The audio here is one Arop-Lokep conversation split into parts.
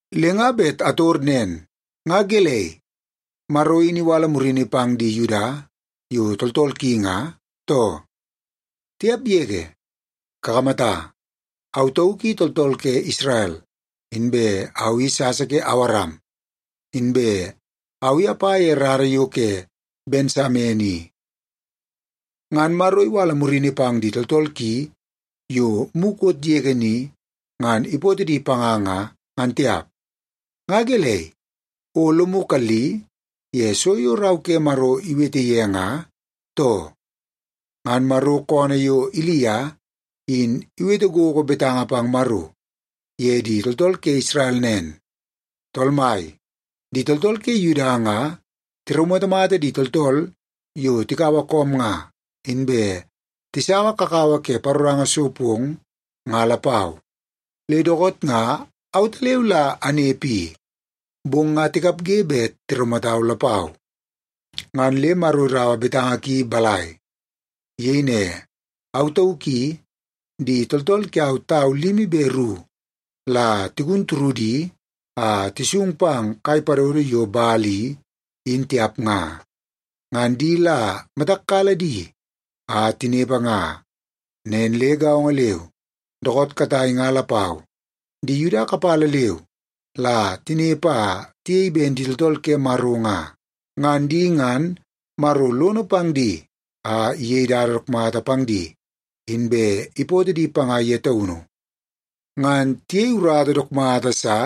Le nga bet ator nen: Nga gelei, Maro in iwala murini pang di Yuda yo tooltool ki nga, too? Tiap yege! Kakamata, au tauk i tooltool ke Isrel, inbe au i sasa ke Awaram, inbe au i apa ye rara yo ke Bensamen i. Ngan Maro iwala murini pang di tooltool ki yo mukot yege ni ngan ipootoo di panga nga, ngan tiap. Nga gelei, o lomu kalli ye so yo Rau ke Maro iwete ye nga, too? Ngan Maro koonoo yo Ilia, in iwete gogo betanga pang Maro ye di tooltool ke Isrel nen, “Tool Mai, di tooltool ke Yuda nga tiraumatamata di tooltool yo tikaua koom nga, inbe tisaua kakawa ke paroranga so pong nga lapau. Le dookoot nga autaleu la anepe i, bong nga tikapge bet tiraumatau lapau.” Ngan le Maro iraua betanga ki balai? Iyei ne, “Au tauk i, di tooltool kiau tau limi be ru la tigun turudi a tisung pang kai padodo yo Bal i, in tiap nga. Ngan di la matak kala di a tinepe nga.” Nen le gaongo leu, dookoot katai nga lapau di Yuda kapala leu la tinepe a tiyei ben di tooltool ke Maro nga. Ngan di ngan Maro lono pang di a iyei dada dook mata pang di, inbe ipootoo di panga ye taunu. Ngan tiyei urata dook mata sa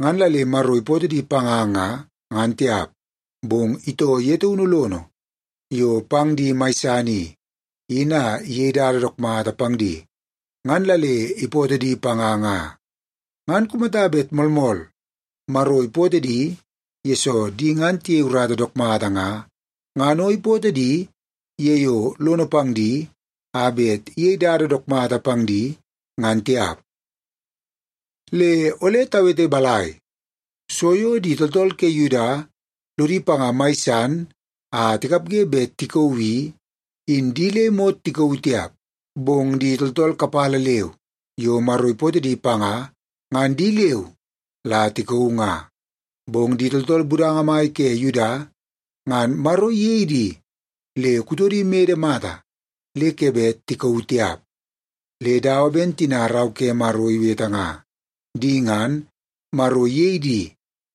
ngan la le Maro ipootoo di panga nga, ngan tiap. Bong itoo ye taunu lono yo pang di mai san i, in a iyei dada dook mata pang di, ngan la le ipootoo di panga nga. Ngan kumata bet moolmool, Maro ipootoo di yesoo di ngan tiyei urata dook mata nga, ngan o ipootoo di ye yo lono pang di a bet iyei dada mata pang di, ngan tiap. Le ole tawete balai? So yo di tooltool ke Yuda lodi panga mai san a tikapge bet tikauu i, in di le imot tikauu tiap, bong di tooltool kapala leu yo Maro ipootoo di panga, ngan di leu la tikauu nga. Bong di tooltool budanga mai ke Yuda ngan Maro iyei di le kutodi imede mata le ke bet tikauu tiap. Le dawa ben tina Rau ke Maro iwete nga, “Di ngan, Maro iyei di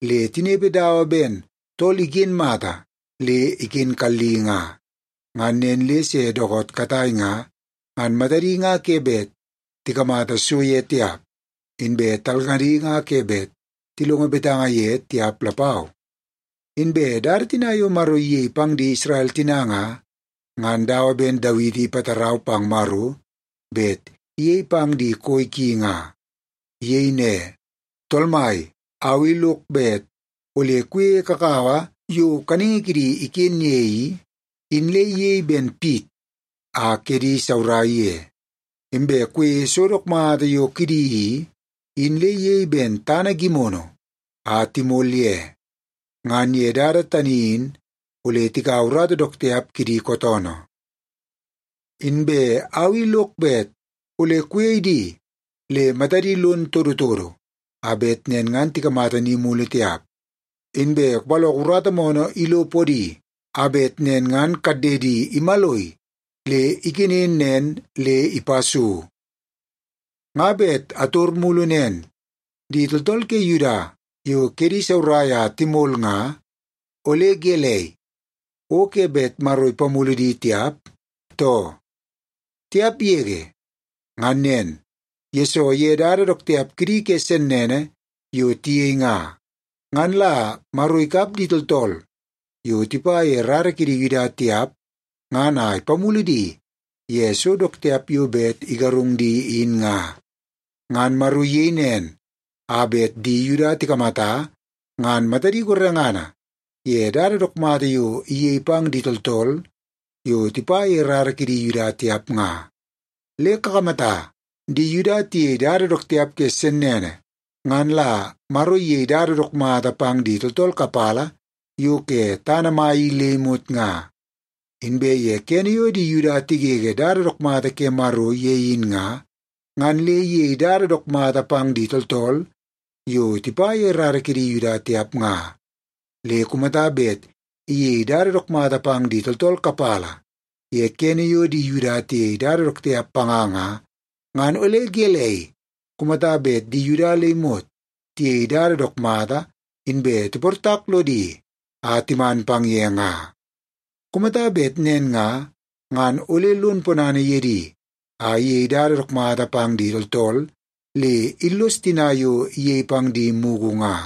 le tinepe dawa ben tool iken mata le iken kalli nga. Ngan nen le se dookoot katai nga, ngan matadi nga ke bet tikamata so ye tiap, inbe talngadi nga ke bet tilongo betanga ye tiap lapau.” Inbe dada tina yo Maro iyei pang di Isrel tina nga, ngan dawa ben Dawiti ipatarau pang Maro bet iyei pang di koi ki nga. Iyei ne, “Tool Mai, au i lok bet ole kuyeie kakawa yo kaningi kidi iken ye i, in le iyei ben pit a kedi saurai ye. Inbe kuyeie so dook mata yo kidi i, in le iyei ben tana gimono a timol ye. Ngan ye dada tani in ole tikaua urata dook tiap kidi kootoonoo. Inbe au i lok bet ole kuyei di le matadi lono todotodo a bet nen ngan tikamata ni mulu tiap. Inbe kupaloko urata moonoo ilo podi, a bet nen ngan kaddedi imaloi le iken nen le ipa so.” Nga bet ator mulu nen: Di tooltool ke Yuda yo kedi saurai a timol nga, ole gelei, o ke bet Maro ipamulu di tiap, too? Tiap yege! Ngan nen, yesoo ye dada dook tiap kidi ke sennene yo tiyei nga, ngan la Maro ikap di tooltool yo tipa ye rara kidi Yuda tiap ngan a ipamulu di ye so dook tiap yo bet igarung di in nga. Ngan Maro iyei nen, a bet di Yuda tikamata ngan matadi gorengana ye dada dook mata yo iyei pang di tooltool yo tipa ye rara kidi Yuda tiap nga. Le kakamata, di Yuda tiyei dada dook tiap ke sennene, ngan la Maro iyei dada dook mata pang di tooltool kapala yo ke tana mai i le imot nga. Inbe ye kene yo di Yuda tigege dada dook mata ke Maro ye in nga, ngan le iyei dada dook mata pang di tooltool yo tipa ye rara kidi Yuda tiap nga. Le kumata bet iyei dada dook mata pang di tooltool kapala ye kene yo di Yuda tiyei dada dook tiap panga nga, ngan ole gelei kumata bet di Yuda le imot tiyei dada dook mata inbe tiportak lodi a timan pang ye nga? Kumata bet nen nga, ngan ole lon ponana ye di a iyei dada dook mata pang di tooltool le illos tina yo iyei pang di mugu nga.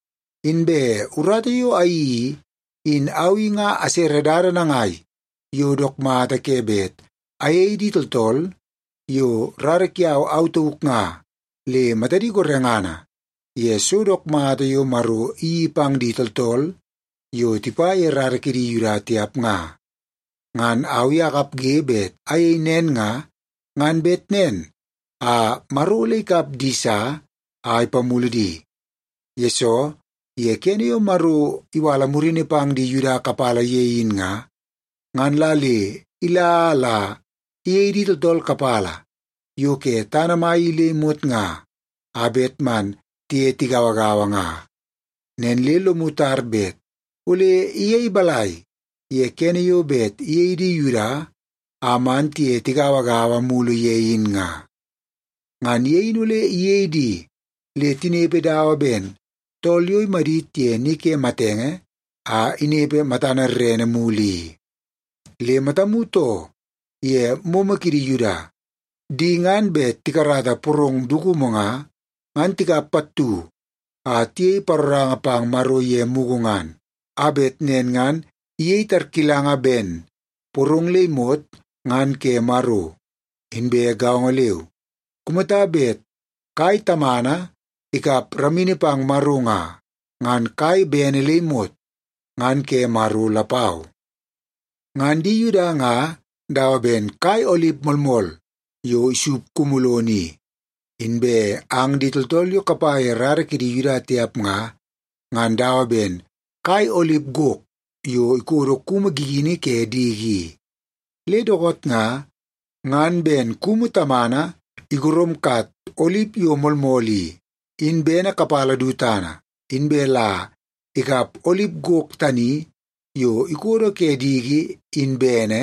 Inbe urata yo ayeii i, in au i nga asere dada nangai yo dook mata ke bet ayei di tooltool yo rara kiau au tauk nga le matadi gorengana ye so dook mata yo Maro iyeii pang di tooltool yo tipa ye rara kidi Yuda tiap nga. Ngan au i akapge bet ayei nen nga, ngan bet nen a Maro ole ikap di sa a ipamulu di. Yesoo ye kene yo Maro iwala murini pang di Yuda kapala ye in nga, ngan la le ila a la iyei di tooltool kapala yo ke tana mai i le imot nga, a bet man tiye tigauagaua nga. Nen le lomu tar bet ole iyei balai ye kene yo bet iyei di Yuda a man tiye tigauagaua mulu ye in nga? Ngan ye in ole iyei di le tinepe dawa ben tool yo imadit ye ni ke matenge a inepe matana rerene mulu i. Le matamu too ye momo kidi Yuda. Di ngan bet tikarata porong dukumu nga, ngan tikap pattu a tiyei paroranga pang Maro ye mugu ngan, a bet nen ngan iyei tarkilanga ben porong le imot ngan ke Maro. Inbe gaongo leu, kumata bet kai tamana ikap ramini pang Maro nga, ngan kai bene le imot ngan ke Maro lapau. Ngan di Yuda nga dawa ben kai olip moolmool yo isup kumu lono i, inbe ang di tooltool yo kapa ye rara kidi Yuda tiap nga, ngan dawa ben kai olip gok yo ikodo kumu gigini ke diki i. Le dookoot nga, ngan ben kumu tamana igoromkat olip yo moolmool i, in bene kapala du tana, inbe la ikap olip gok tani yo ikodo ke diki in bene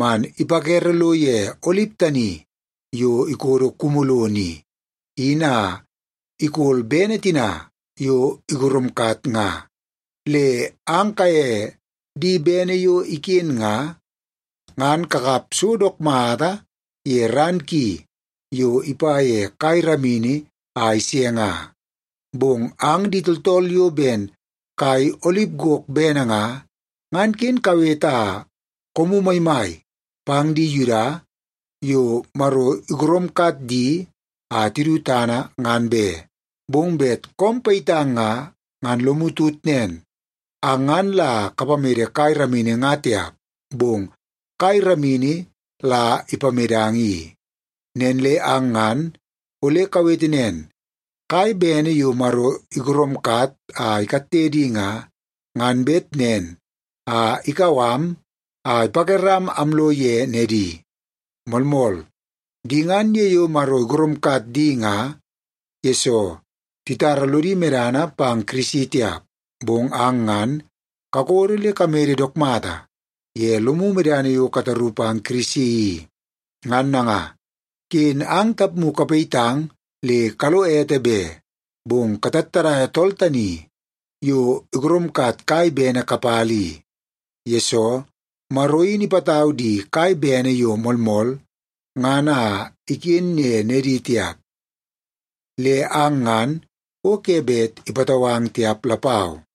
man ipakere lo ye olip tani yo ikodo kumu lono i, in a ikol bene tina yo igoromkat nga. Le ang kaye di bene yo iken nga, ngan kakap so dook mata ye ran ki yo ipa ye kai ramini a ise nga. Bong ang di tooltool yo ben kai olip gok bene nga, ngan ken kawete a koomu maimai pang di Yuda yo Maro igoromkat di a tidu tana, ngan be. Bong bet koom payitang nga, ngan lomu tut nen, ang ngan la kapamede kai ramini nga tiap, bong kai ramini la ipamedang i. Nen le ang ngan ole kawete nen, “Kai bene yo Maro igoromkat a ikatte di nga, ngan bet nen a ikau am a ipakeram amlo ye nedi.” Moolmool, di ngan ye yo Maro igoromkat di nga, yesoo titara lodi medana pang Kirisi tiap. Bong ang ngan kakodo le kamede dook mata ye lomu medana yo kataru pang Kirisi i. Ngan nanga, ken ang tapmu kayitmakang le kalo ete be, bong katattadaia tool tani yo igoromkat kai bene kapala i. Yesoo, Maro in ipatau di kai bene yo moolmool ngan a iken ye nedi tiap, le ang ngan o ke bet ipatau ang tiap lapau.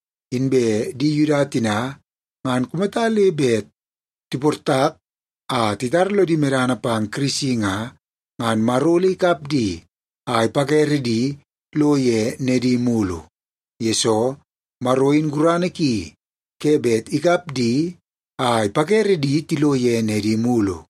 Inbe di Yuda tina, ngan kumata le bet tiportak a titara lodi medana pang Kirisi nga, ngan Maro ole ikap di a ipakere di lo ye nedi mulu. Yesoo, Maro in gurana ki ke bet ikap di a ipakere di tilo ye nedi mulu.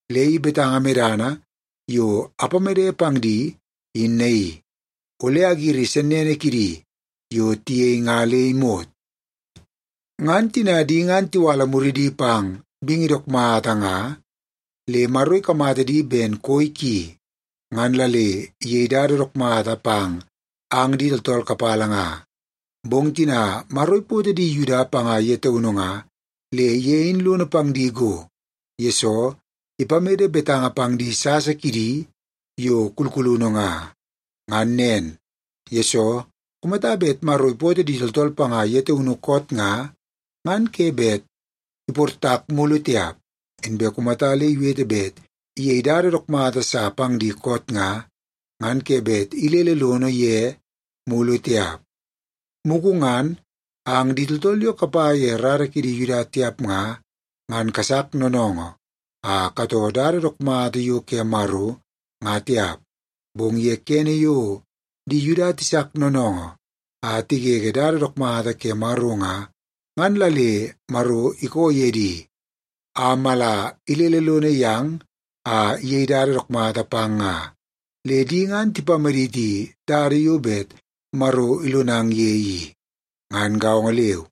Le i betanga medana yo apamede pang di, in naii: Ole agiri sennene kidi yo tiyei nga le imot.” Ngan tina di ngan tiwala muridi pang bingi dook mata nga, le Maro ikamata di ben koi ki, ngan la le iyei dada dook mata pang ang di tooltool kapala nga. Bong tina Maro ipootoo di Yuda panga ye taunu nga, le ye in lono pang di go, yesoo ipamede betanga pang di sasa kidi yo kulkulunu nga. Ngan nen, yesoo kumata bet Maro ipootoo di tooltool panga ye taunu koot nga, ngan ke bet iportak mulu tiap. Inbe kumata le iwete bet iyei dada dook mata sa pang di koot nga, ngan ke bet ilele lono ye mulu tiap. Mugu ngan, ang di tooltool yo kapa ye rara kidi Yuda tiap nga, ngan kasak noonoongoo a katoo dada dook mata yo ke Maro nga tiap. Bong ye kene yo di Yuda tisak noonoongoo a tigege dada dook mata ke Maro nga, ngan la le Maro ikoo ye di a mala ilele lono yang a iyei dada dook mata pang nga. Le di ngan tipamaditi dada yo bet Maro ilonang ye i. Ngan gaongo leu,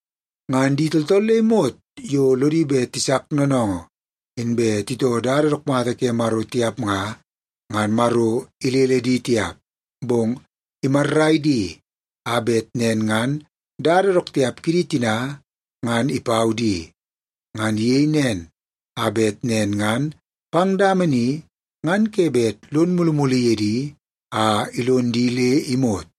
Ngan di tooltool le imot yo lodi bet tisak noonoongoo inbe titoo dada dook mata ke Maro tiap nga, ngan Maro ilele di tiap, bong imarrai di a bet nen ngan dada dook tiap kidi tina, ngan ipau di. Ngan iyei nen, a bet nen ngan pang dama ni ngan ke bet lon mulumulu ye di a ilon di le imot.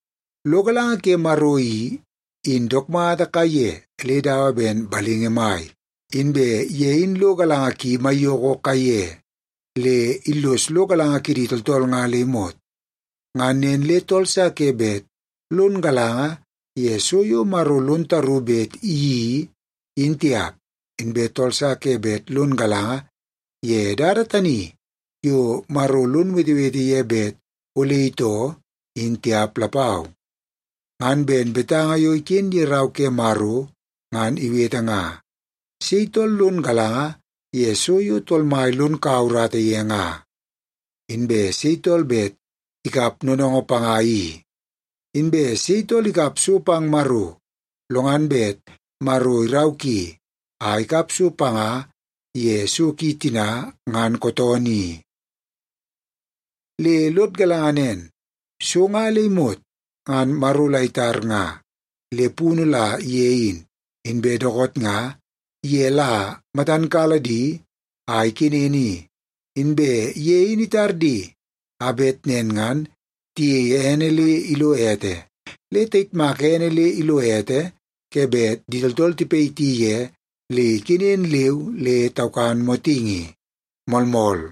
Lo galanga ke Maro i, in dook mata kaiye le dawa ben balingi mai! Inbe ye in lo galanga ki maiyoko kaiye, le illos lo galanga kidi tooltool nga le imot. Ngan nen le tool sa ke bet lon galanga ye so yo Maro lon taru bet iyeii, in tiap. Inbe tool sa ke bet lon galanga ye dada tani yo Maro lon wetewete ye bet ole itoo, in tiap lapau. Ngan ben betanga yo iken ye Rau ke Maro ngan iwete nga, “Sei tool lon galanga ye so yo Tool Mai lon kaua urata ye nga? Inbe sei tool bet ikap noonoongoo panga i?” “Inbe sei tool ikap so pang Maro, lo ngan bet Maro irau ki a ikap so panga ye so ki tina, ngan kootoonoo i?” Le lod galanga nen, so nga le imot ngan Maro la itar nga, le punu la ye in. Inbe dookoot nga, ye la matan kala di a ikenen i. Inbe ye in itar di a bet nen ngan tiyeie ene le ilo ete. Le tayitmaka ene le ilo ete ke bet di tooltool tipayiti ye le ikenen leu le taukan motingi. Moolmool.